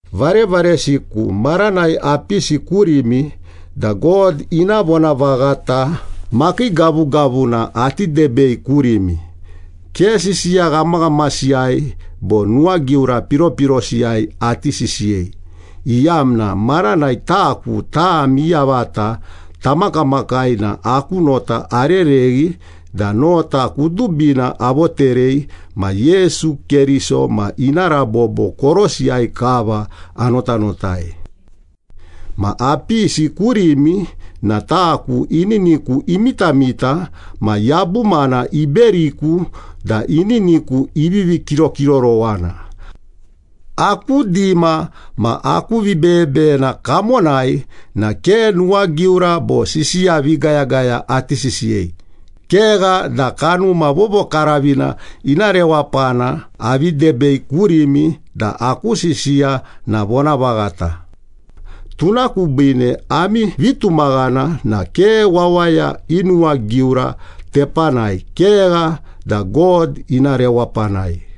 Varevaresiku, maranai apisi kurimi da God ina vonavaghata makii gavugavuna ati debei kurimi, ke sisiya ghamaghamasiyai bo nuwagiura piropirosiyai ati sisiyei, iyamna maranai taku, tami yavata tamakamakai na aku nota arereghi da nota kudubina avoterei ma Yesu Keriso ma ina rabobo korosiyai kava anotanotai. Ma apisi kurimi na taku ininiku imitamita ma yabumana iberiku da ininiku ivivi kirokirorowana. Aku dima ma aku vibeyebeyena kamonai na ke nuwagiura bo sisiya vigayagaya ati sisiyei, kegha da Kanuma Vovokaravina ina rewapana avi debei kurimi da aku sisiya na vonavaghata. Tuna kubiine ami vitumaghana na ke wawaya i nuwagiura tepanai, kegha da God ina rewapanai.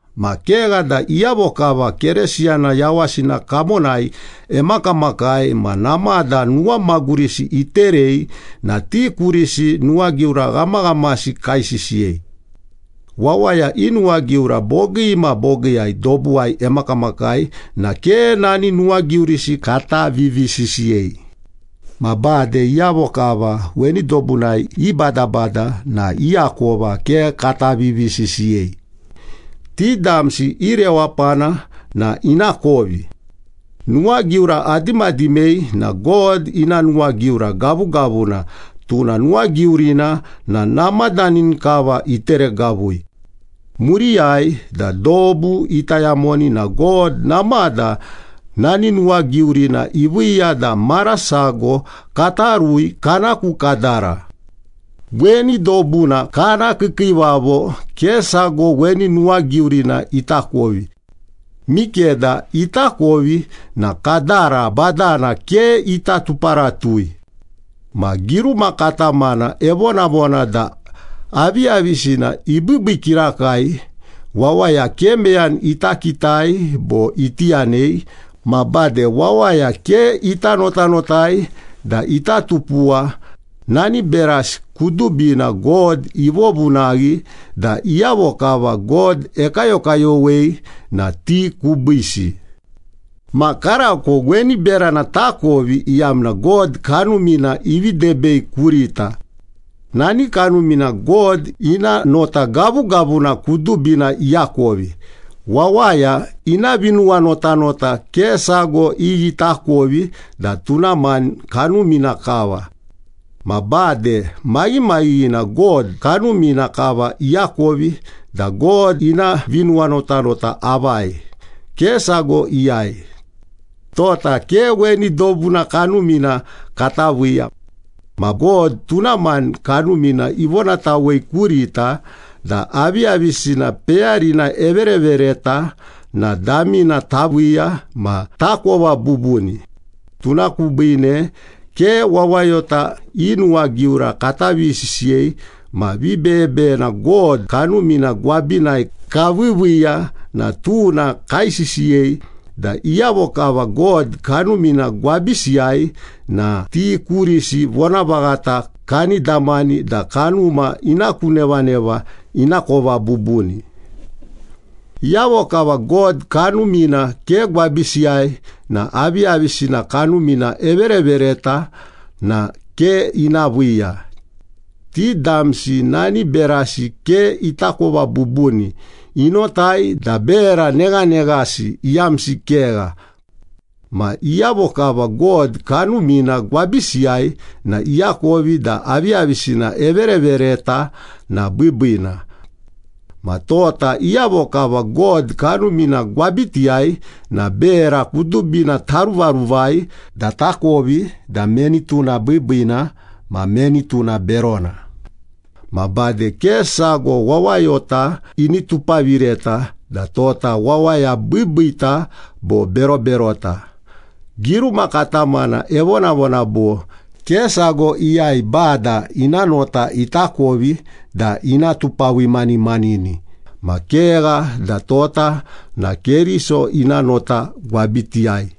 Ma kegha da iyavo kava Keresiyana yawasina kamonai emakamakai ma namada nuwamagurisi iterei na ti kurisi nuwagiura ghamaghamasi kaisisiyei. Wawaya i nuwagiura bogii ma bogiiyai dobuwai emakamakai na ke nani nuwagiurisi kata vivisisiyei. Ma bade iyavo kava weni dobunai ibadabada na i akova ke kata vivisisiyei. Ti damsi i rewapana na ina kovi. Nuwagiura adimadimei na God ina nuwagiura gavugavuna, tuna nuwagiurina na namadani kava iteregavui. Muriyai da dobu ita yamoni na God namada nani nuwagiurina iviiya da mara sago kata rui kana ku kadara. Weni dobuna kana kiikiivavo ke sago weni nuwagiurina itakovi. Mikeda itakovi na Kadara Badana ke ita tuparatui. Ma giruma katamana evonavona da, “Aviyavisina ibiibii kirakai, wawaya ke meyani ita kitai bo iti yanei, ma bade wawaya ke ita notanotai da ita tupuwa, nani berasi kudubina God ivovunaghi da iyavo kava God ekayokayowei na ti kubiisi.” Ma karako weni berana takovi, iyamna God Kanumina ivi debei kurita. Nani Kanumina God ina nota gavugavuna kudubina iakovi. Wawaya ina vinuwanotanota ke sago iyi itakovi da tuna mani kanumina kava. Ma bade maghimaghighina God Kanumina kava iakovi da God ina vinuwanotanota avai, ke sago iyai. Tota ke weni dobuna kanumina kata viiya. Ma God tuna mani Kanumina ivonatawei kurita da aviyavisina peyarina everevereta na damina taviiya ma takova bubuni. Tuna kubiine ke wawayota i nuwagiura kata vivisisiyei ma vibeyebeyena God Kanumina gwabinai kaviiviiya na tuna kaisisiyei, da iyavo kava God Kanumina gwabisiyai na ti kurisi vonavaghata kani damani da kanuma ina ku nevaneva inakova bubuni. Iyavo kava God Kanumina ke gwabisiyai na aviyavisina Kanumina everevereta na ke ina viiya. Ti damsi nani berasi ke itakova bubuni, inotai da bera neghaneghasi, iyamsi kegha. Ma iyavo kava God Kanumina gwabisiyai na iakovi da aviyavisina everevereta na biibiina. Ma tota iyavo kava God Kanumina gwabitiyai na bera kudubina taruvaruvai da takovi da meni tuna biibiina ma meni tuna berona. Ma bade ke sago wawayota ini tupavireta da tota wawaya biibiita bo beroberota. Giruma katamana evonavona bo, “Ke sago iyai Bada ina nota itakovi da ina tupavimanimanini.” Ma kegha da tota na Keriso ina nota gwabitiyai.